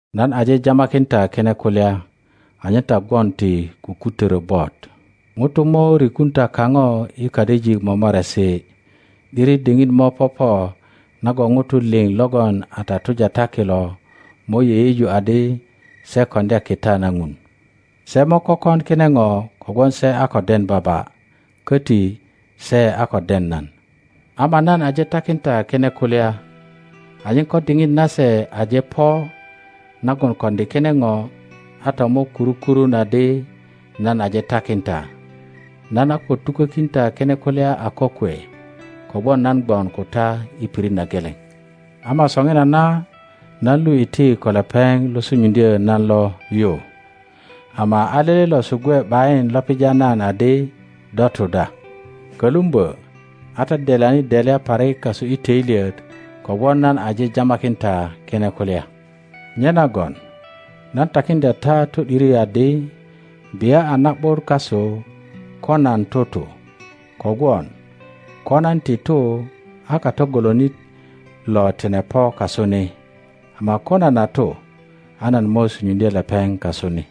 Nan aje jamakin ta kine kulya anyen ta gwon ti kukutörö bot. Ŋutu mo rikun ta kaŋo i kadijik momoresi. ’Diri diŋit mo popo nagon ŋutu liŋ logon a tatuja ta kilo mo yeyeju adi se koŋdya kita na Ŋun. Se mo kökon kine ŋo kogwon se a ko den Baba, koti se a ko den nan. Ama nan aje takin ta kine kulya anyen ko diŋit nase aje po nagon koŋdi kine ŋo, a ta mo kuru kurun adi nan aje takin ta. Kita na Mulökötyo Loke Nan a ko tukökin ta kine kulya a kokwe, kogwon nan gwon ko ta i pirit na geleŋ. Ama soŋinana nan lu iti ko lepeŋ lo sunyuŋdyo nan lo yu, ama a lele losu gwe ’bayin lo pija nan adi, Do tu da? Kölumbö a ta delyani delya parik kasu i töilyet kogwon nan aje jamakin ta kine kulya. Nyenagon nan takiŋdya ta to ’diri adi, bia a na ’but kasu ko nan tutu, kogwon ko nan ti tu, a Kato golonit lo tine po kasu ni, ama ko nan a tu, a nan mo sunyuŋdye lepeŋ kasu ni.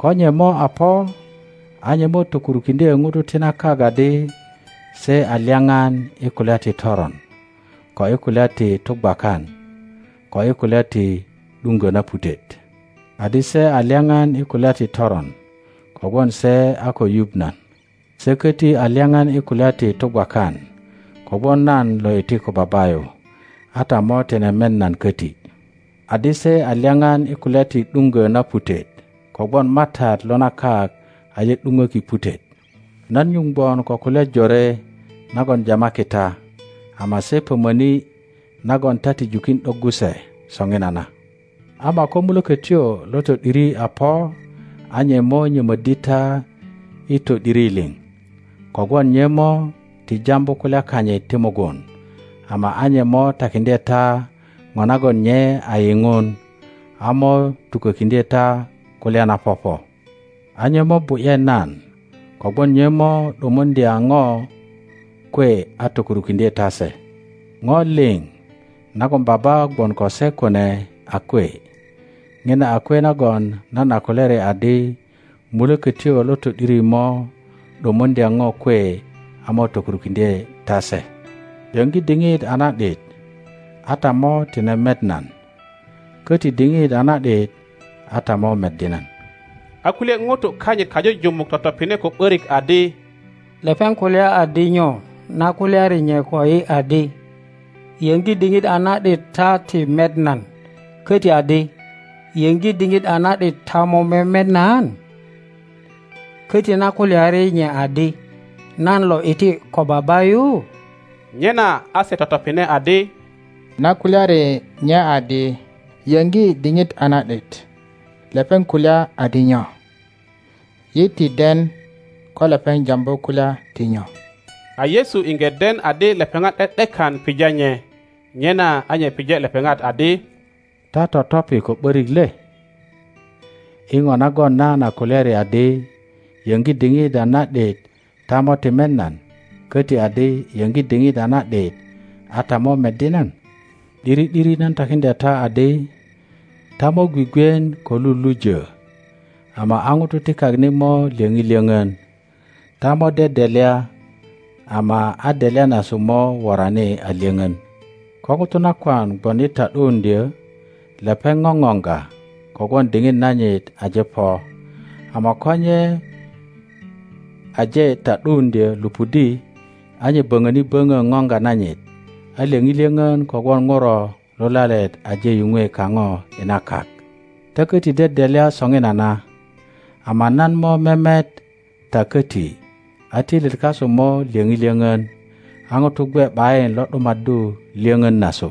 Ko nye mo a po, a nye mo tokurukiŋdye ŋutu ti na kak adi se a lyaŋan i kulya ti toron, ko i kulya ti tugwakan, ko i kulya ti ’duŋgö na putet. Adi, se a lyaŋan i kulya ti toron kogwon se a ko yuŋ nan; se köti a lyaŋan i kulya ti tugwakan kogwon nan lo iti ko Baba yu, a ta mo tine met nan koti; adi, se a lyaŋan i kulya ti ’duŋgo na putet, kogwon matat lo na kak aje ’duŋöki putet. Nan nyuŋ gwon ko kulya jore nagon jamaki ta, ama se pömöni nagon ta ti jukin ’doggu se soŋinana; ama ko Mulökotyo lo to ’diri a po a nye mo nyömöddi ta i to ’diri liŋ; kogwon nye mo ti jambu kulya kanyit ti mugun, ama a nye mo takiŋdye ta ŋo nagon nye a yiŋun, a mo tukökiŋdye ta kulya na popo. A nye mo bu ’ye nan, kogwon nye mo ’dumuŋdya ŋo kwe a tokurukiŋdye ta se. Ŋo liŋ nagon Baba gwon ko se kune a kwe; ŋina a kwe nagon nan a kulyari adi, Mulökötyo lo to ’diri mo ’dumuŋdya ŋo kwe a mo tokurukiŋdye ta se. Yöŋgi diŋit a na ’dit ta mo ti met nan; köti diŋit a na ’dit a ta mo meddi nan. A kulye ŋutu kanyit kajujumuk totopine ko ’börik adi, Lepeŋ kulya adi nyo, na kulyari nye koyi adi, Yöŋgi diŋit a na ’dit ta ti met nan; koti adi, Yöŋgi diŋit a na ’dit ta mo memet nan? Köti na kulyari nye adi, Nan lo iti ko Baba yu? Nyena a se totopine adi, Na kulyari nye adi, Yöŋgi diŋit a na ’dit, lepeŋ kulya adi nyo? Yi ti den ko lepeŋ jambu kulya ti nyo. A Yesu iŋge den adi lepeŋat ’de ’dekan pija nye, nyena a nye pije lepeŋat adi, Ta totopi ko ’börik le, i ŋo nagon nan a kulyari adi, Yoŋgi diŋit a na ’dit ta mo ti met nan; köti adi, Yöŋgi diŋit a na ’dit a ta mo meddi nan? ’Diri ’diri, nan takiŋdya ta adi ta mo gwigwien ko lulujö, ama a ŋutu ti kak ni mo lyöŋi lyöŋön; ta mo dedelya, ama a delya nasu mo worani a lyoŋön. Ko ŋuto nakwan gwon i ta ’duuŋdyö, lepeŋ ŋoŋoŋga kogwon diŋit nanyit aje po, ama ko nye aje ta ’duuŋdyö lupudi, a nye böŋöni böŋö ŋoŋga nanyit a lyöŋi lyöŋön kogwon ŋuro lulalet aje yuŋwe kaŋo i na kak. Ta köti dedelya soŋinana, ama nan mo memet ta koti, a töilyet kasu mo lyöŋi lyoŋön, a ŋutu gwe ’bayin lo ’dumaddu lyöŋön nasu.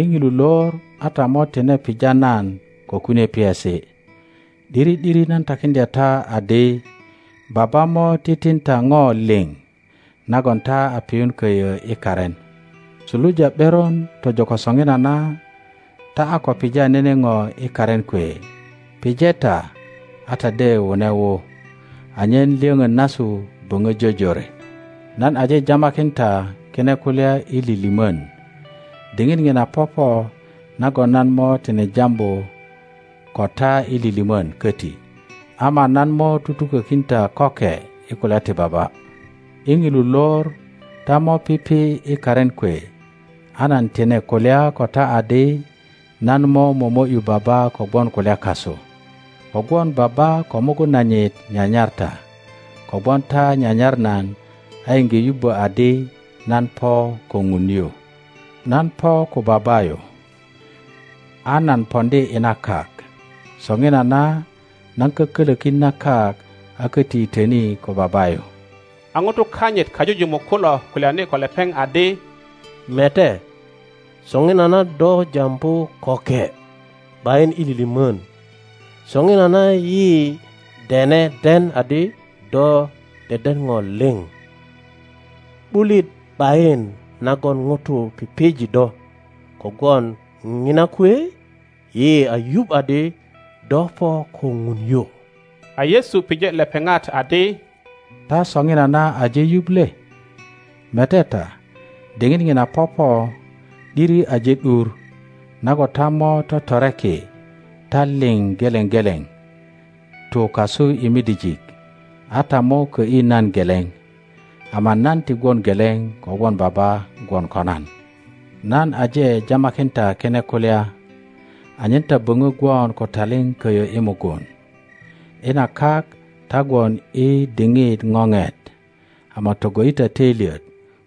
i ŋilu lor a ta mo tine pija nan ko kunie piesi. ’Diri ’diri, nan takiŋdya ta adi Baba mo titin ta ŋo liŋ nagon ta a piyun köyö i karin. Suluja ’beron tojo ko soŋinana ta a ko pija nene ŋo i karin kwe; pije ta, a ta de wune wu, anyen lyöŋön nasu böŋö jojore. Nan aje jamakin ta kine kulya i lilimon. Diŋit ŋina popo nagon nan mo tine jambu ko ta i lilimön köti, ama nan mo tutukökin ta köke i kulya ti Baba. I ŋilu lor ta mo pipi i karin kwe, a nan tine kulya ko ta adi nan mo momo ’yu Baba kogwon kulya kasu, kogwon Baba ko mugun nanyit nyanyar ta, kogwon ta nyanyar nan a iŋge yubbö adi nan po ko Ŋun yu. Nan po ko Baba yu, a nan poŋdi i na kak; soŋinana nan kokölökin na kak a köti yitöni ko Baba yu. A ŋutu kanyit kajujumuk kulo kulyani, ko lepeŋ adi, Mete, soŋinana do jambu köke, ’bayin i lilimön. Soŋinana yi dene den adi do deden ŋo liŋ, ’bulit ’bayin nagon ŋutu pije do; kogwon ŋina kwe yi a yuŋ adi do po ko Ŋun yu. A Yesu pije lepeŋat adi, Ta soŋinana aje yuŋ le? Mete ta, diŋit ŋina popo, ’diri aje ’dur, nagon ta mo totoreki, ta liŋ geleŋ geleŋ tu kasu i midijik, a ta mo kö ’yi nan geleŋ; ama nan ti gwon geleŋ, kogwon Baba gwon ko nan. Nan aje jamakin ta kine kulya anyen ta boŋö gwon ko taliŋ köyö i mugun. I na kak ta gwon i diŋit ŋoŋet. Ama togo ’yi ta töilyet,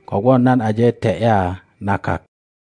kogwon nan aje te ’ya na kak.